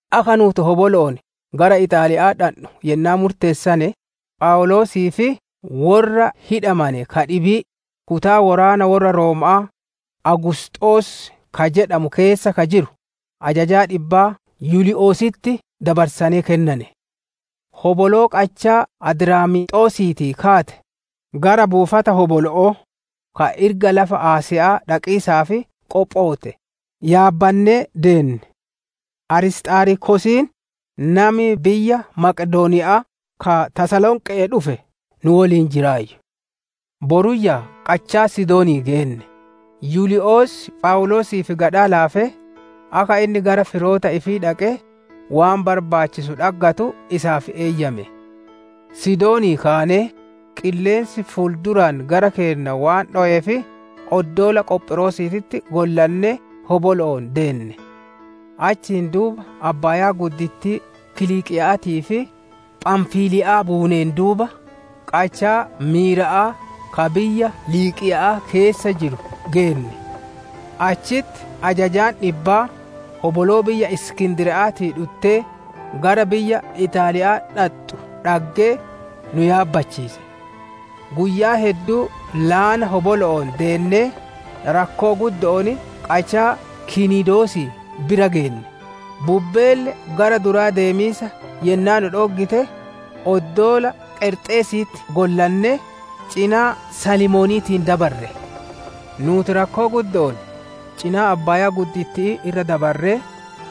Akka nuuti hobolo'oon gara Ixaaliya'aa dhandhu yennaa murteessane, Phawuloosii fi worra hidhamane ka dhibii, kutaa woraana worra Rooma'aa «Awugusxoos» ka jedhamu keessa ka jiru, ajajaa dhibbaa Yulii'ositti dabarsanee kennane. Hoboloo qachaa Adraamiixosiitii kaatee, gara buufata hobolo'oo, ka irga lafa Asiya'aa dhaqiisaaf qophootte, yaabbannee deenne. Arisxaarkosiin, nami biyya Maqedooniya'aa ka Tasalonqe'ee dhufe nu woliin jiraayyu. Boruyyaa qachaa Sidoonii geenne; Yulii'os Phawuloosiif gadhaa laafee, akka inni gara firoota ifii dhaqee, waan barbaachisu dhaggatu isaaf eeyyame. Sidoonii kaanee, qilleensi ful-duraan gara keenna waan dhoweef oddoola Qophiroosiititti gollannee hobolo'oon deenne. Achiin duuba abbaayaa Qiliiqiya'aatii fi Phamfiliya'aa buuneen duuba, qachaa Miira'aa ka biyya Liiqiya'aa keessa jiru geenne. Achitti ajajaan dhibbaa, hoboloo biyya Iskindiriya'aatii dhuttee, gara biyya Ixaaliya'aa dhaxxu dhaggee, nu yaabbachiise. Guyyaa hedduu laana hobolo'oon deennee, rakkoo guddo'oon qachaa Kiniidoosii bira geenne; bubbeelle gara duraa deemiisa yennaa nu dhooggite, oddoola Qareexisiititti gollannee, cinaa Salmooniitiin dabarre. Nuuti rakkoo guddo'oon cinaa abbaaya'aa irra dabarree,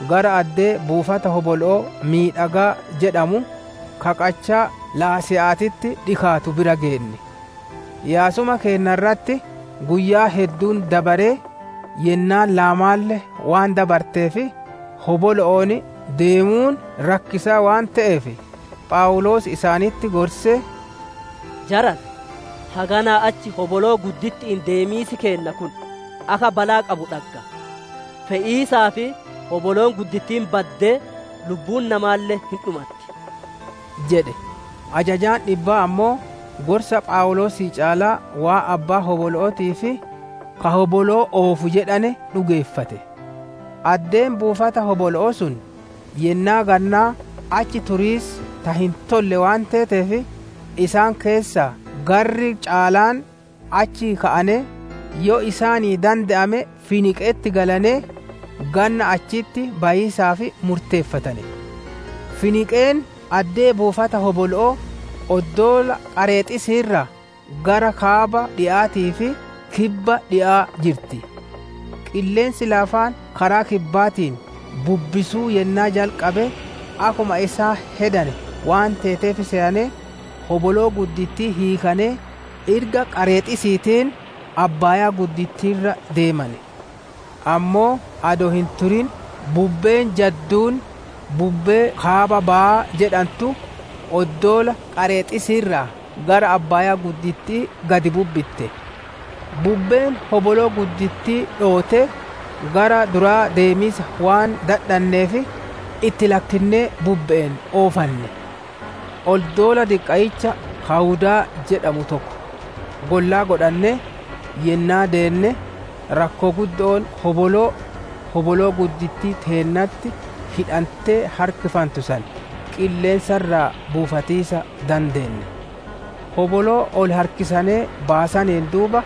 gara addee «Buufata hobolo'oo miidhagaa» jedhamu, ka qachaa Lase'aatitti dhikaatu bira geenne. Yaasuma keenna irratti guyyaan hedduun dabaree, yennaan laamaalle waan dabarteef, hobolo'oon deemuun rakkisaa waan te'eef, Phawuloos isaanitti gorsee, «Jarana! Haganaa achi hoboloo gudditti'iin deemiisi keenna kun akka balaa qabu dhagga; fe'iisaa fi hoboloon guddittiin baddee, lubbuun namaalle hin dhumatti» jedhe. Ajajaan dhibbaa ammoo, gorsa Phawuloosii caalaa, waan abbaan hobolo'ootii fi ka hoboloo oofu jedhane dhugeeffate. Addeen buufata hobolo'oo sun, yennaa gannaa achi turiisaaf ta hin tolle waan teeteef, isaan keessa garri caalaan, achii ka'anee, yoo isaanii dande'ame Finiiqe'etti galanee, ganna achitti bayiisaaf murteeffatane. Finiiqeen addee buufata hobolo'oo, oddoola Qareexisii irraa gara kaaba dhi'aatii fi kibba dhi'aa jirti. Qilleensi laafaan karaa kibbaatiin bubbisuu yennaa jalqabe, akkuma isaan hedane waan teeteef seyanee, hoboloo guddittii hiikanee irga Qareexisiitiin abbaayaa irra deemane. Ammoo adoo hin turin bubbeen jadduun, «Bubbee kaaba bahaa» jedhantu, oddoola Qareexisii irraa gara abbaaya'aa gad bubbitte. Bubbeen hoboloo guddittii dhoottee, gara duraa deemiisa waan dadhanneef, itti lakkinnee bubbe'een oofanne. Oddoola diqqayyicha Kaawudaa jedhamu tokko gollaa godhannee yennaa deenne, rakkoo guddo'oon hoboloo, hoboloo guddittii teennatti hidhantee harkifantu san, qilleensa irraa buufatiisa dandeenne. Hoboloo ol harkisanee baasaneen duuba,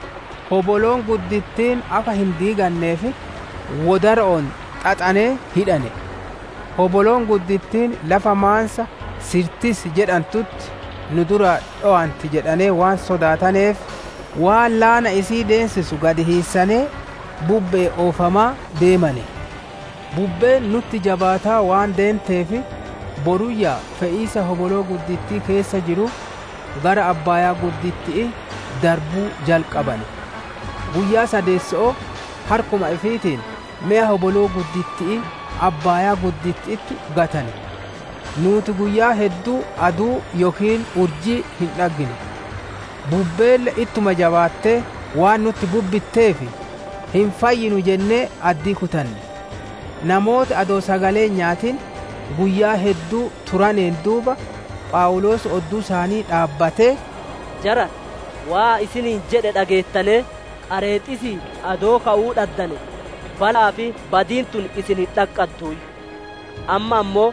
hoboloon guddittiin akka hin diiganneef wodaro'oon xaxanee hidhane. Hoboloon guddittiin lafa maansa Sirtis jedhantutti nu duraa dhowanti jedhanee waan sodaataneef, waan laana isii ideensisu gad hiissanee, bubbe'een oofamaa deemane. Bubbeen nutti jabaataa waan deenteef, boruyyaa fe'iisa hoboloo guddittii keessa jiru, gara abbaaya'aa darbuu jalqabane. Guyyaa sadeesso'oo, harkuma ifiitiin meya hoboloo gudditti'ii abbaayaa gudditti'itti gatane. Nuuti guyyaa hedduu aduu yookiin urjii hin dhaggine; bubbeelle ittuma jabaattee waan nutti bubbitteef, hin fayyinu jennee addii kutane. Namooti adoo sagalee hin nyaatin guyyaa hedduu turaneen duuba, Phawuloos odduu isaanii dhaabbatee, «Jarana, waan ani isiniin jedhe dhageettanee Qareexisii adoo ka'uu dhaddane, bala'aa fi badiin tun isin hin dhaqqadduuyyu. Amma ammoo,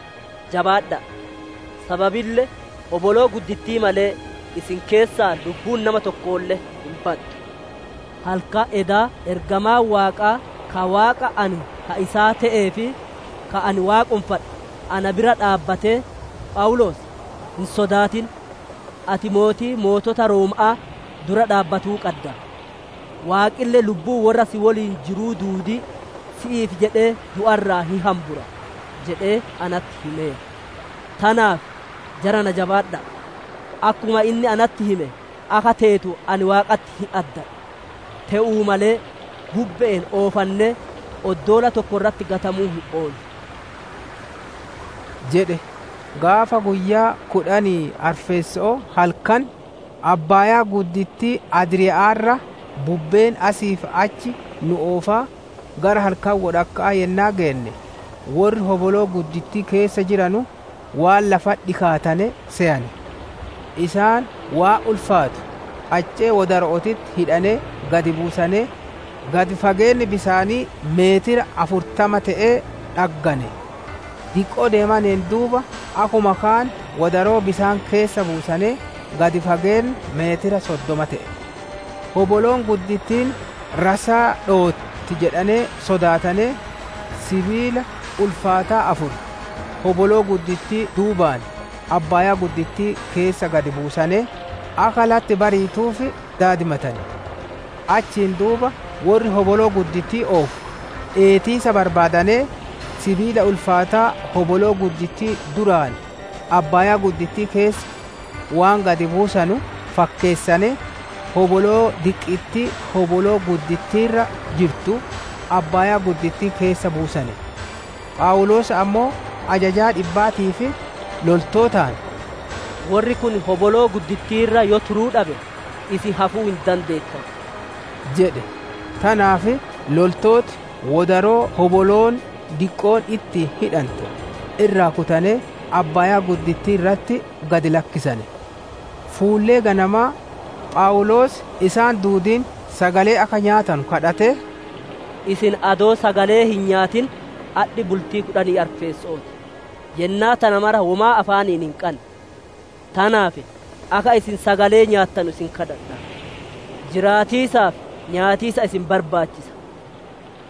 jabaadha'a! Sababille hoboloo guddittii malee, isin keessaa lubbuun nama tokkolle hin baddu. Halkan edaa ergamaan Waaqaa ka Waaqa ani ka isaa te'ee fi ka ani waaqonfadhuu, na bira dhaabbatee, ‹Phawuloos, hin sodaatin! Ati Mootii Mootota Rooma'aa dura dhaabbatuu qadda. Waaqille lubbuu worra si woliin jiruu duudii, si'iif jedhee du'a irraa hin hambura› jedhee natti himeera. Tanaaf, jarana jabaadha'a! Akkuma inni natti hime akka teetu ani Waaqatti hin addadha. Te'uu malee, bubbe'een oofannee, oddoola tokko irratti gatamuu hin oollu» jedhe. Gaafa guyyaa kudhanii arfeesso'oo halkan, abbaayaa Adriiya'aa irra bubbeen asii fi achi nu oofaa, gara halkan wodhakka'aa yennaa geenne, worri hoboloo guddittii keessa jiranu, waan lafatti dhikaatane seyane. Isaan waan ulfaatu qaccee wodaro'ootitti hidhanee gad buusanee, gad fageenni bisaanii meetira afurtama te'ee dhaggane; diqqoo deemaneen duuba akkuma kaan wodaroo bisaan keessa buusanee gad fageenni meetira soddoma te'e. Hoboloon guddittiin rassaa dhootti jedhanee sodaatanee, sibiila ulfaataa afur, hoboloo guddittii duubaan abbaayaa keessa gad buusanee, akka latti bariituuf daadimatane. Achiin duuba worri hoboloo guddittii oofu, dheetiisa barbaadanee, sibiila ulfaataa hoboloo guddittii duraan abbaayaa keessa waan gad buusanu fakkeessanee, hoboloo diqqittii hoboloo guddittii irra jirtu, abbaayaa keessa buusane. Phawuloos ammoo ajajaa dhibbaatii fi loltootaan, «Worri kun hoboloo guddittii irra yoo turuu dhabe, isin hafuu hin dandeettanu» jedhe. Tanaaf loltooti wodaroo hoboloon diqqoon ittiin hidhante irraa kutanee abbaayaa irratti gad lakkisane. Fuullee ganamaa, Phawuloos isaan duudiin sagalee akka nyaatanu kadhatee, «Isin adoo sagalee hin nyaatin adhi bultii kudhanii arfeesso'oo ti; yennaa tana mara womaa afaaniin hin qanne. Tanaaf, akka isin sagalee nyaattanu isin kadhadha; jiraatiisaaf nyaatiisa isin barbaachisa.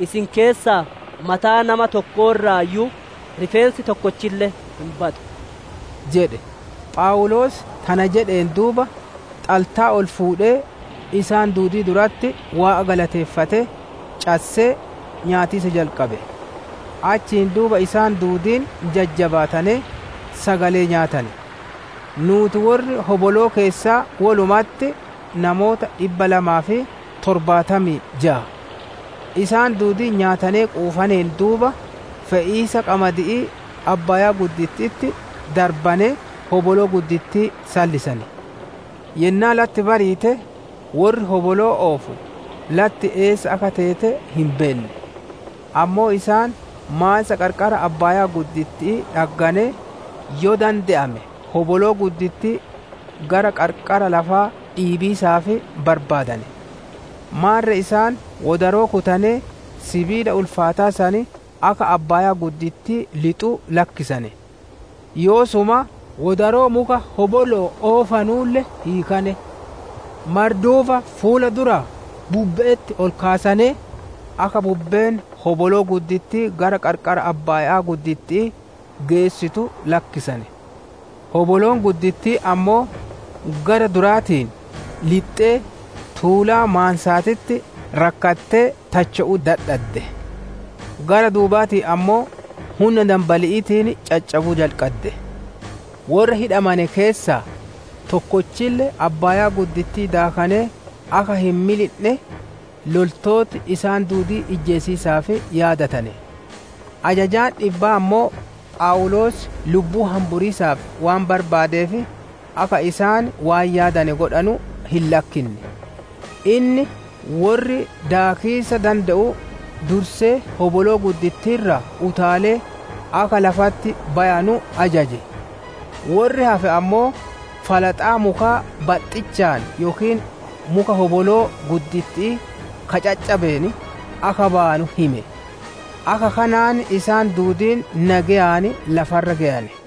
Isin keessaa mataa nama tokkoo irraayyuu rifeensi tokkolle hin badu» jedhe. Phawuloos tana jedheen duuba, xaltaa ol fuudhee, isaan duudii duratti Waaqa galateeffatee, cassee, nyaatiisa jalqabe. Achiin duuba isaan duudiin jajjabaatanee, sagalee nyaatane. Nuuti worri hoboloo keessaa wolumatti namoota dhibba lamaa fi torbaatamii jaa. Isaan duudiin nyaatanee quufaneen duuba, fe'iisa qamadi'ii abbaayaa gudditti'itti darbanee hoboloo guddittii sallisane. Yennaa latti bariite, worri hoboloo oofu latti eessa akka teete hin beenne; ammoo isaan maansa qarqara abbaaya'aa dhagganee, yoo dande'ame hoboloo guddittii gara qarqara lafaa dhiibiisaaf barbaadane. Maarre isaan wodaroo kutanee sibiila ulfaataa san akka abbaayaa keessa lixu lakkisane; yoosuma wodaroo muka hobolo'oon oofanulle hiikane. Marduufa fuula duraa bubbe'etti ol kaasanee, akka bubbeen hoboloo guddittii gara qarqara abbaaya'aa geessitu lakkisane. Hoboloon guddittiin ammoo gara duraatiin lixxee, tuulaa maansaatitti rakkattee tacho'uu dadhadde; gara duubaatiin ammoo hunna danbali'iitiin caccabuu jalqadde. Worra hidhamane keessaa tokkolle abbaayaa daakee akka hin milindhe, loltooti isaan duudii ijjeesiisaaf yaadatane. Ajajaan dhibbaa ammoo Phawuloos lubbuu hamburiisaaf waan barbaadeef, akka isaan waan yaadane godhanu hin lakkinne. Inni worri daakiisa dande'u dursee hoboloo guddittii irraa utaalee akka lafatti bayanu ajaje; worri hafe ammoo, falaxaa mukaa baxxichaan yookiin muka hoboloo gudditti'ii ka caccabeen akka bayanu hime. Akka kanaan isaan duudiin nageyaan lafa irra geyane.